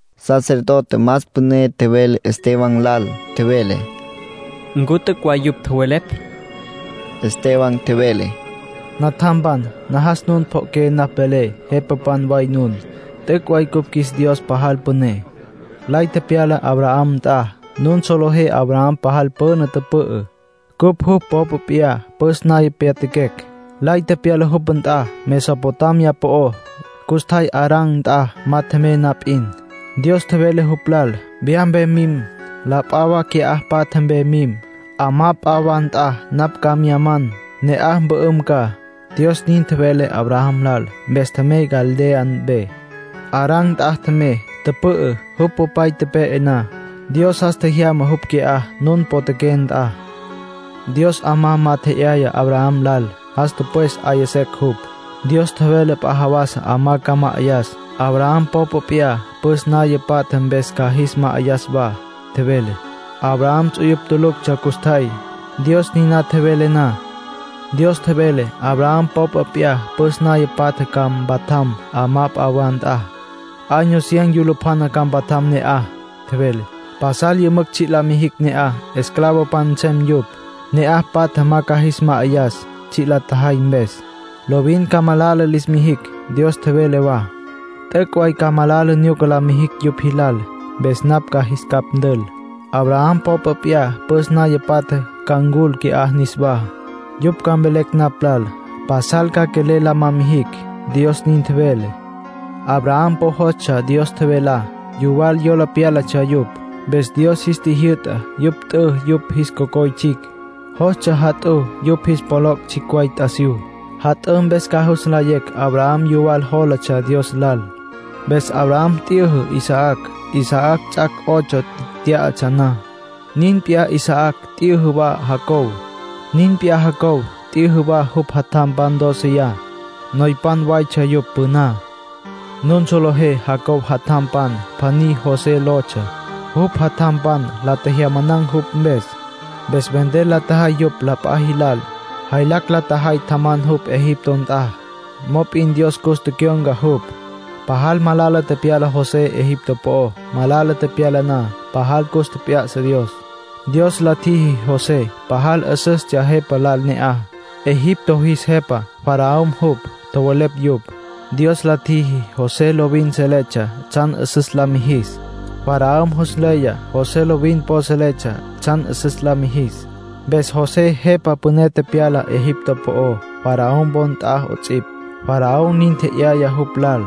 Sacerdote más püné tjevele Esteban lal. Tjevele: —¿Ncu t'üc' way yupj tjowelepj? Esteban tjevele: —Natjampan, najas nun pjo'oqué napj velé. Jepapan way nun. T'üc' way cupj qjuis Dios pajal püné. Lay tepyala Abraham nt'a. Nun solejé Abraham pajal püna tüpü'ü, cupj jupj popa p'iyá püs naya pyatjaquecj. Lay tepyala jupj nt'a Mesopotamia po'ó, custjay Harán nt'a ma tjemey na p'in. Dios tjevele jupj lal: ‘Wya mpe mim. La p'a wa qui'á patja mpe mim. 'Amá p'a wa nt'a napj ca mya man. Ne'aj mpü'üm ca’, Dios nin tjevele Abraham lal. Mpes tjemey Caldea mpe. Harán nt'a tjemey, tüpü'ü. Jupj popay tepe'e na, Dios jas tjejyama jupj qui'á, nun potjaqué nt'a. Dios 'amá ma tje'yaya Abraham lal. Jas tüpwes 'aya secj jupj. Dios tjevele p'a jawasa 'amá ca ma'ayas. Abraham popa p'iyá püs naya patja mpes ca jis ma'ayas wa, tjevele. Abraham ts'uyupj tuluctsja custjay, Dios niná tjevele na. ”Dios tjevele: ‘Abraham popa p'iyá püs naya patja ca mpatjam 'amá p'a wa nt'a. Año cien yulupjana ca mpatjam ne'aj —tjevele—. Pasal yümücj tsji' la mijicj ne'aj, esclavopan nsem yupj. Ne'aj patja ma ca jis ma'ayacj tsji' la tjajay mpes. Lovin ca malala lis mijicj.’ Dios tjevele wa: ‘T'üc' way ca malala nyuca la mijicj yupj jilal. Mpes napj ca jis capj ntül. Abraham popa p'iyá püs naya patja ca ncul qui'á niswá. Yupj ca mvelecj napj lal. Pasal ca quelel la ma jicj’, Dios nin tjevele. Abraham po jostsja Dios tjevelá. Yuwal yola pyálatsja yupj. Mpes Dios jis tjijyü'ta yupj t'ü yupj jis cocoy tsjicj. Jostsja jat'ǘ yupj jis pjoloc' tsjicj way t'asiyú. Jat'ǘ mpes ca jus nlayecj Abraham yuwal jólatsja Dios lal. Mpes Abraham t'yüjü Isaac, Isaac ts'ac' ocho tyá'atsja na. Nin p'iyá Isaac t'yüjü wa Jacob. Nin p'iyá Jacob t'yüjü wa jupj jatjampan dóceya. Noypan waytsja yupj püná. ”Nun solejé Jacob jatjam pjaní José lotsja. Jupj jatjampan la tjejyamanan̈ jupj mpes. Mpes vender la tjajay jupj la p'a jilal. Jaylacj la tjajay tjaman jupj Egipto nt'a. Mop'in Dios cus tecyon̈ca jupj. Pajal malala tepyala José Egipto po'ó. Malala tepyala na, pajal cus tjep'ya'sa Dios. Dios la tjiji José pajal 'üsüstsja jepa lal ne'aj, (Egipto jis jepa Faraón jupj tjowelepj yupj.) Dios la tjiji José lovin seletsja tsjan 'üsüs la mijis. Faraón jus nleya José lovin po seletsja tsjan 'üsüs la mijis. Mpes José jepa püné tepyala Egipto po'ó, Faraón wo nt'a 'ots'ipj, Faraón nin tje'yaya jupj lal.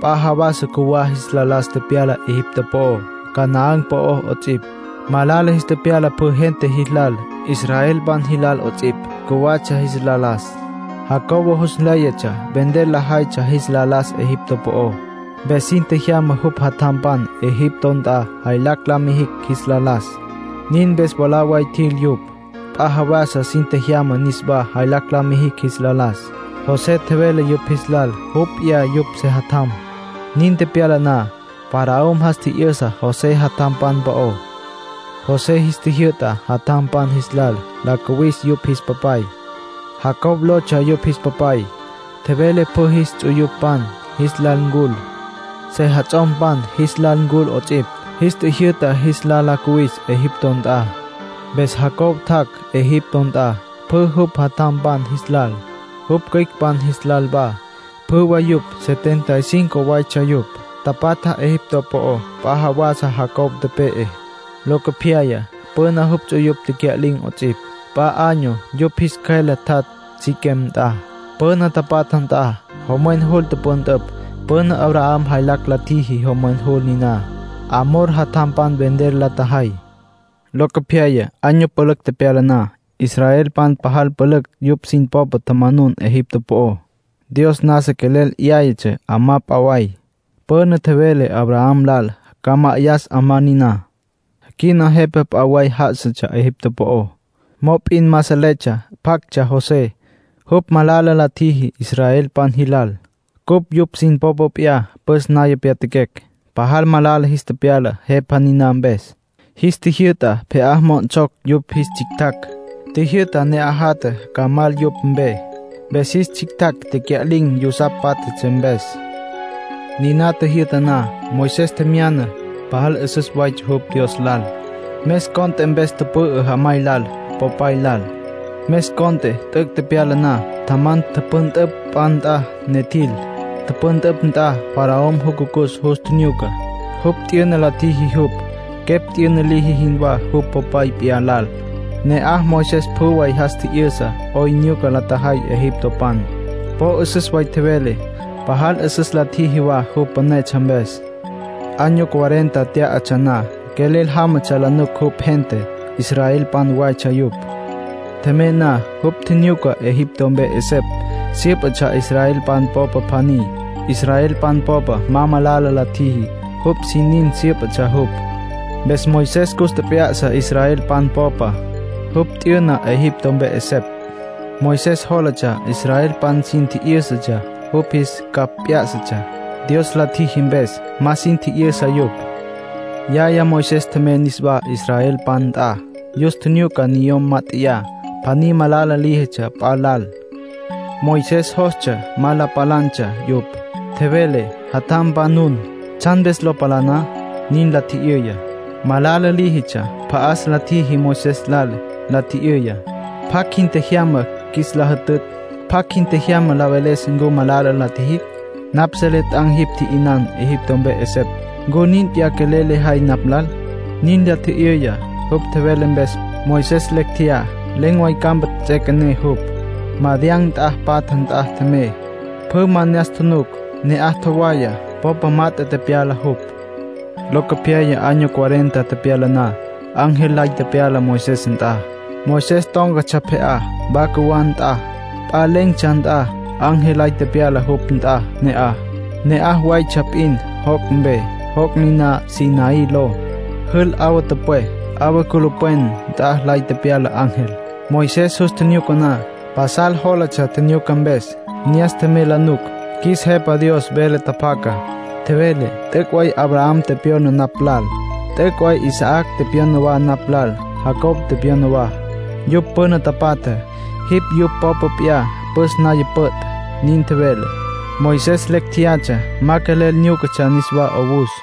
”P'a jawasa cjuwá jis la las tepyala Egipto po'ó, Canaán po'ó 'ots'ipj. Malala jis tepyala pjü gente jilal, israelpan jilal 'ots'ipj, cjuwatsja jis la las. Jacob jus nléyatsja vender lajaytsja jis la las Egipto po'ó. Mpes sin tjejyama jupj jatjampan Egipto nt'a jaylacj la mijicj jis la las. Nin mpes mwalá way tjil yupj. P'a jawasa sin tjejyama niswá jaylacj la mijicj jis la las. José tjevele yupj jis lal jupj p'iyá yupj sejatjam. Nin tepyala na, Faraón jas tji'yüsa José jatjampan po'ó. José jis tjijyü'ta jatjampan jis lal la cuwis yupj jis papay. Jacob lotsja yupj jis papay. Tjevele pjü jis ts'uyupan jis lal ncul, sejats'ompan jis lal ncul 'ots'ipj. Jis tjijyü'ta jis lal la cuwis Egipto nt'a. Mpes Jacob tjac' Egipto nt'a, pjü jupj jatjampan jis lal, jupj cüicpan jis lal wa. Pjü way yupj setenta y cinco waytsja yupj. Tapatja Egipto po'ó. P'a jawasa Jacob tepe'e. Locopyaya, püna, jupj ts'uyupj tecya'lin̈ 'ots'ipj. P'a año yupj jis cjüele tjat' Siquem nt'a, püna tapatja nt'a. Jomwen jul tüpüntüpj. Püna Abraham jaylacj la tjiji jomwen jul niná, Hamor jatjampan vender la tjajay. ”Locopyaya, año pülücj tepyala na, israelpan pajal pülücj yupj sin popé tjamanun Egipto po'ó. Dios nasa quelel 'yáyatsja 'amá p'a way, püna tjevele Abraham lal ca ma'ayas 'amá niná. Quina jepa p'a way já'asatsja Egipto po'ó. Mop'in ma seletsja pjactsja José. Jupj malala la tjiji israelpan jilal. Cupj yupj sin popa p'iyá püs naya pyatjaquecj. Pajal malala jis tepyala jepa niná mpes. Jis tjijyü'ta pje'á mo'onsocj yupj jis tsjictjacj. Tjijyü'ta ne'aj jatja ca mal yupj mpe, mpes jis tsjictjacj tecya'lin̈, yusapj pátjatsja mpes. ”Niná tjijyü'ta na, Moisés tjemya'na. Pajal 'üsüs waytsja jupj Dios lal. Mes cont'e mpes tüpü'ü jamay lal, popay lal. Mes cont'e t'üc' tepyala na, tjaman, tüpüntüpj p'a nt'a, ne tjil. Tüpüntüpj nt'a Faraón jucucus jus tjinyuca. Jupj t'yüna la tjiji jupj, quepj t'yüna liji jinwá jupj popa p'iyá lal. Ne'aj Moisés pjü way jas tji'yüsa 'oyn nyuca la tjajay egiptopan. Po 'üsüs way tjevele, pajal 'üsüs la tjiji wa, jupj pünetsja mpes. ”Año cuarenta tyá'atsja na, quelel jámatsja la nuc jupj gente, israelpan waytsja yupj. Tjemey na, jupj tjinyuca Egipto mpe 'esepj syǘpatsja israelpan popa pjaní. Israelpan popa ma malala la tjiji, jupj sin nin syǘpatsja jupj. Mpes Moisés cus tjep'ya'sa israelpan popa. Jupj tji'yü'na Egipto mpe 'esepj. Moisés jólatsja israelpan sin tji'yǘsatsja jupj jis capj p'yá'satsja, Dios la tjiji mpes. Ma sin tji'yüsa yupj. ”Yaya Moisés tjemey niswá israelpan nt'a. Yus tjinyuca niyom mát'eya; pjaní malala líjitsja p'a lal. Moisés jostsja ma la palantsja yupj. Tjevele: ‘Jatjampan nun. ¿Tsjan mpes lo palaná?’ nin la tji'yüya. Malala líjitsja pja'as la tjiji Moisés lal, la tji'yüya: ‘¿Pjacj jin tjejyama qjuis la jütütj? ¿Pjacj jin tjejyama la veles ncu malala la tjijicj? Napj selé t'an̈ jipj tji'yünan Egipto mpe 'esepj. ¿Ncu nin p'iyá quelel lejay napj lal?’ nin la tji'yüya. Jupj tjevele mpes, Moisés lecj tjeyá. Len̈ way campa ts'üequené jupj. Madián nt'a patja nt'a tjemey. Pjü ma ne'as tjunuc. Ne'aj tjowaya, popa mat'e tepyala jupj. ”Locopyaya, año cuarenta tepyala na, ángel lay tepyala Moisés nt'a. Moisés tón̈catsja pje'á, wa cjuwá nt'a, p'a len̈tsja nt'a. Ángel lay tepyala jupj nt'a ne'aj. Ne'aj waytsja p'in joc' mpe, joc' niná Sinaí ló. Jül 'awa tüpwé. 'Awa culupwen nt'a lay tepyala ángel. Moisés jus tjinyuca na, pasal jólatsja tjinyuca mpes. Ne'as tjemey la nuc. Qjuis Jepa Dios vele tjapjaca. Tjevele: ‘T'üc' way Abraham tepyona napj lal. T'üc' way Isaac tepyona wa napj lal, Jacob tepyona wa. Yupj püna tapatja, jipj yupj popa p'iyá püs naya püt'’, nin tjevele. Moisés lecj tjeyatsja, ma quelel nyúcatsja niswá 'owus.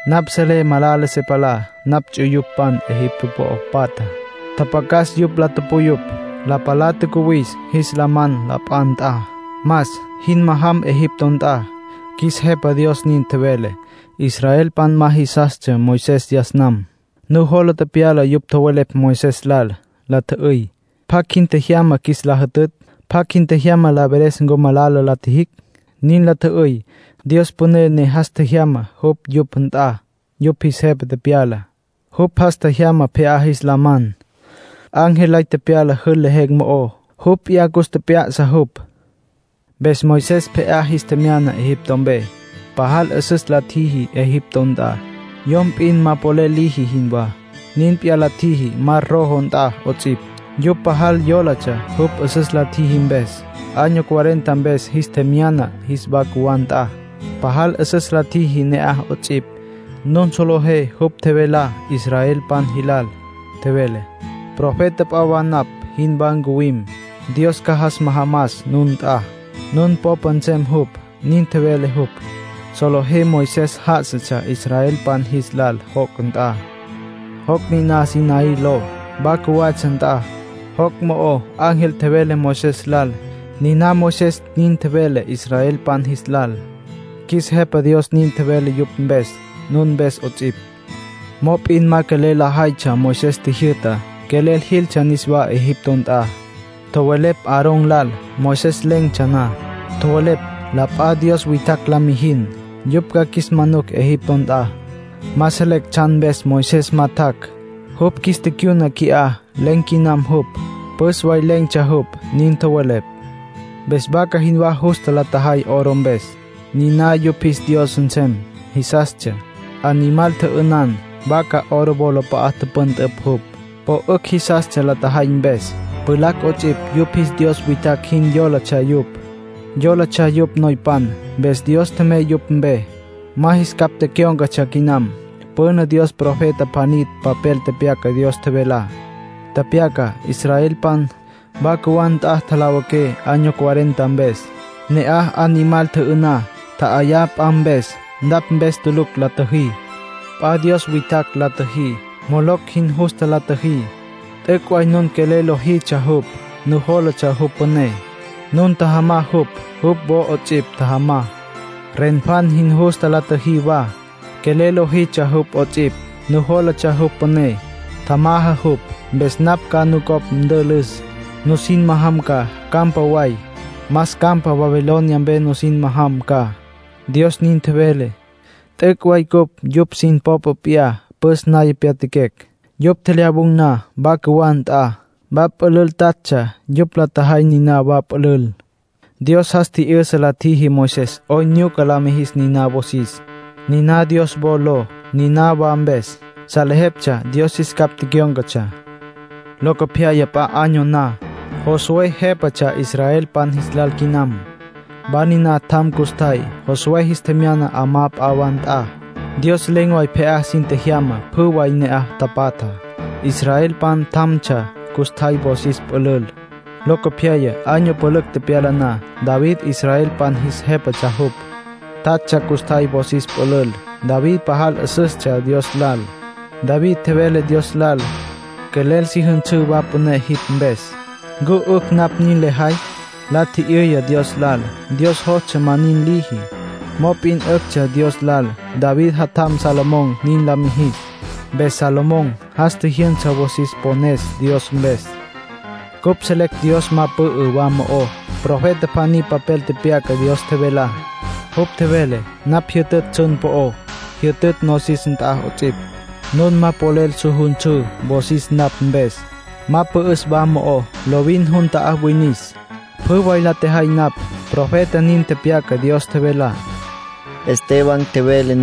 Napj selé malala se palá napj ts'uyupan Egipto po'o patjá. Tjapjacas yupj la puyupj. La palá tjacuwis jis la man la p'a nt'a. Mas. Jin majam Egipto nt'a’, qjuis Jepa Dios nin tjevele. ”Israelpan ma jisastsja Moisés yas nam. Nujola tepyala yupj tjowelepj Moisés lal. La tjü'üy: ‘¿Pjacj jin tjejyama qjuis la jütütj? ¿Pjacj jin tjejyama la veles ncu malala la tjijicj?’ nin la tjü'üy. Dios püné ne jas tjejyama jupj yupj nt'a, yupj jis jepa tepyala. Jupj jas tjejyama pje'á jis la man. Ángel lay tepyala jül lejen̈ mo'ó, jupj p'iyá cus tjep'ya'sa jupj. Mpes Moisés pje'á jis tjemyana Egipto mpe. Pajal 'üsüs la tjiji Egipto nt'a, yom p'in ma polel liji jinwá. Nin p'iyá la tjiji Mar Rojo nt'a 'ots'ipj. Yupj pajal yólatsja jupj 'üsüs la tjiji mpes. Año cuarenta mpes jis tjemyana jis wa cjuwá nt'a. Pajal 'üsüs la tjiji ne'aj 'ots'ipj. Nun solejé jupj tjevelá israelpan jilal. Tjevele: ‘Profeta p'a wa napj jinwá ncuwim; Dios ca jas majamas nun nt'a. Nun popa nsem jupj’, nin tjevele jupj. Solejé Moisés já'asatsja israelpan jis lal joc' nt'a, joc' niná Sinaí ló, wa cjuwatsja nt'a. Joc' mo'o ángel tjevele Moisés lal. Niná Moisés nin tjevele israelpan jis lal. Qjuis Jepa Dios nin tjevele yupj mpes, nun mpes 'ots'ipj. ”Mop'in ma quelel lajaytsja Moisés tjijyü'tá. Quelel jiltsja niswá Egipto nt'a. Tjowelepj Aarón lal, Moisés len̈tsja na. Tjowelepj: ‘La p'a dios witjacj la mijin. Yupj ca qjuis manucj Egipto nt'a. Ma selecj tsjan mpes Moisés ma tjac'. Jupj qjuis ticyuna qui'á. Len̈ quinam jupj. Püs way len̈tsja jupj’, nin tjowelepj. Mpes vaca jinwá justa la tjajay oro mpes. Niná yupj jis dios nsem jisastsja. Animal tjü'ünan, vaca oro wolap'a'a tüpüntüpj jupj. Po 'ücj jisastsja la tjajay mpes. ”Pjulacj 'ots'ipj yupj jis dios witjacj jin yólatsja yupj. Yólatsja yupj noypan. Mpes Dios tjemey yupj mpe. Ma jis capj tecyón̈catsja quinam. Püna Dios profeta pjaní papel tepyaca Dios tjevelá. Tepyaca: ‘Israelpan, wa cjuwá nt'a tjalawiqué año cuarenta mpes. Ne'aj animal tjü'ü'ná, tja'ayá p'a mpes. Napj mpes tulucj la tjüjí. P'a dios witjacj la tjüjí. Moloc jin justa la tjüjí. T'üc' way nun quelel lojitsja jupj. Nujólatsja jupj püné. Nun tjajamá jupj, jupj wo 'ots'ipj tjajamá. Renfán jin justa la tjüjí wa. Quelel lojitsja jupj 'ots'ipj. Nujólatsja jupj püné. Tjajamá jupj. Mpes napj ca nucopj ntülüs. Nusin majam ca campa way, más campa Babilonia mpe nusin majam ca’, Dios nin tjevele. ”T'üc' way cupj yupj sin popa p'iyá püs naya pyatjaquecj. Yupj tjelyawun̈ na wa cjuwá nt'a, wa pülül tatsja. Yupj la tjajay niná wa pülül. Dios jas tji'yüsa la tjiji Moisés 'oyn nyuca la mijis niná wosis. Niná Dios wo ló. Niná wa mpes, salejeptsja Dios jis capj tecyón̈catsja. Locopyaya, p'a año na, Josué jépatsja israelpan jis lal quinam. Wa niná tjam custjay. Josué jis tjemyana 'amá p'a wa nt'a. Dios len̈ way pje'á sin tjejyama pjü way ne'aj tapatjá. Israelpan tjamtsja custjay wosis pülül. Locopyaya, año pülücj tepyala na, David israelpan jis jépatsja jupj. Tatsja custjay wosis pülül. David pajal 'üsüstsja Dios lal. David tjevele Dios lal: ‘Quelel si jünsǘ wa püné jipj mpes. ¿Ncu 'ücj napj nin lejay?’ la tji'yüya Dios lal. Dios jostsja ma nin liji. Mop'in 'üctsja Dios lal David jatjam Salomón nin la mijis. Mpes Salomón jas tjijyünsa wosis pones Dios mpes. ”Cupj selecj Dios ma pü'ü wa mo'ó. Profeta pjaní papel tepyaca Dios tjevelá. Jupj tjevele: ‘Napj jyütütj tsjun po'ó. Jyütütj nosis nt'a 'ots'ipj. Nun ma polel su jünsǘ wosis napj mpes. Ma pü'üs wa mo'ó. Lovin jun ta'á winis. Pjü way la tjejay napj’, profeta nin tepyaca Dios tjevelá —Esteban nin tjevele.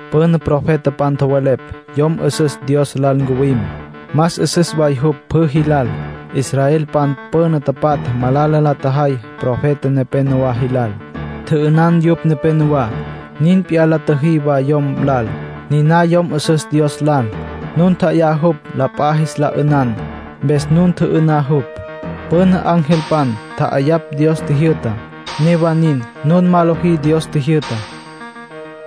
Püna profetapan tjowelepj Yom 'Üsüs Dios Lal ncuwim, más 'üsüs way jupj pjü jilal. Israelpan püna tapatja malala la tjajay profeta nepénowa jilal. Tjü'ünan yupj nepenowá. Nin p'iyá la tjüjí wa yom lal, niná Yom 'Üsüs Dios Lal. Nun tja'ayá jupj la p'a jis la 'ünan. Mpes nun tjü'ü'ná jupj. Püna angelpan tja'ayapj Dios tjijyü'tá. Newa nin, nun ma lojí Dios tjijyü'tá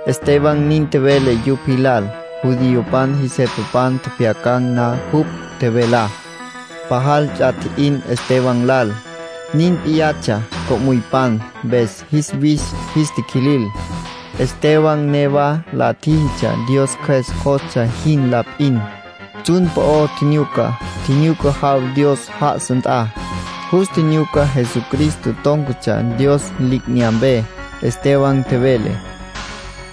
—Esteban nin tjevele yupj jilal. Judiopan jis jepapan tjepjyacan̈ na jupj tjevelá, pajal ts'a tji'in Esteban lal. Nin p'iyatsja co'müypan. Mpes jis wis jis tiquilil. Esteban newa la tjíjitsja Dios Cjües jostsja jin la p'in. Tsjun po'o tjinyuca. Tjinyuca jaw Dios já'asa nt'a. Jus tjinyuca Jesucristo tón̈catsja Dios li'inyampe. Esteban tjevele: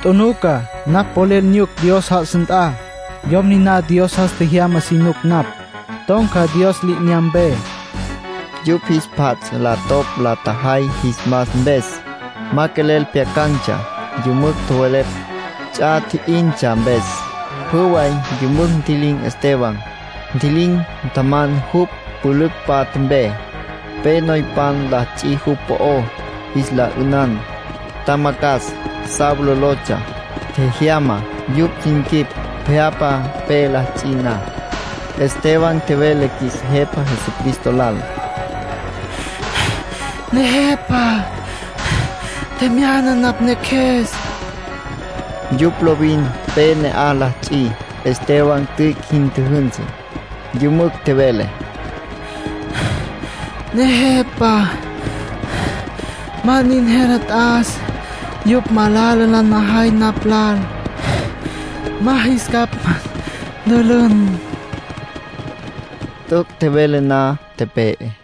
—Tjunuca. Napj polel nyuc Dios já'asa nt'a. Yom niná Dios jas tjejyamá si nuc napj. Ton̈ca Dios li'inyampe —nin tjevele Esteban. Yupj jis pjats' la topj la tjajay jis mas mpes. Ma quelel pjyacan̈tsja. Yümücj tjowelepj, ts'a tji'intsja mpes. Pjü way yümücj ntji'lin̈ Esteban. Ntji'lin̈, tjaman jupj pülücj patja mpe. Pe noypan la ts'i jupj po'ó, jis la 'ünan. Tjamacjas, Saulo lotsja, tjejyama yupj sin quip pje'apa pe la ts'i na. Esteban tjevele qjuis Jepa Jesucristo lal: —Nejepa, tjemyana napj neqjues —nin tjevele. Yupj lovin pe ne'aj la ts'i. Esteban tüic' jin tjüjünsü, yümücj tjevele: —Nejepa, ma nin jele t'as yupj malala lajay napj lal. Ma jis capj ntülün. T'üc' tjevele na, tepe'e.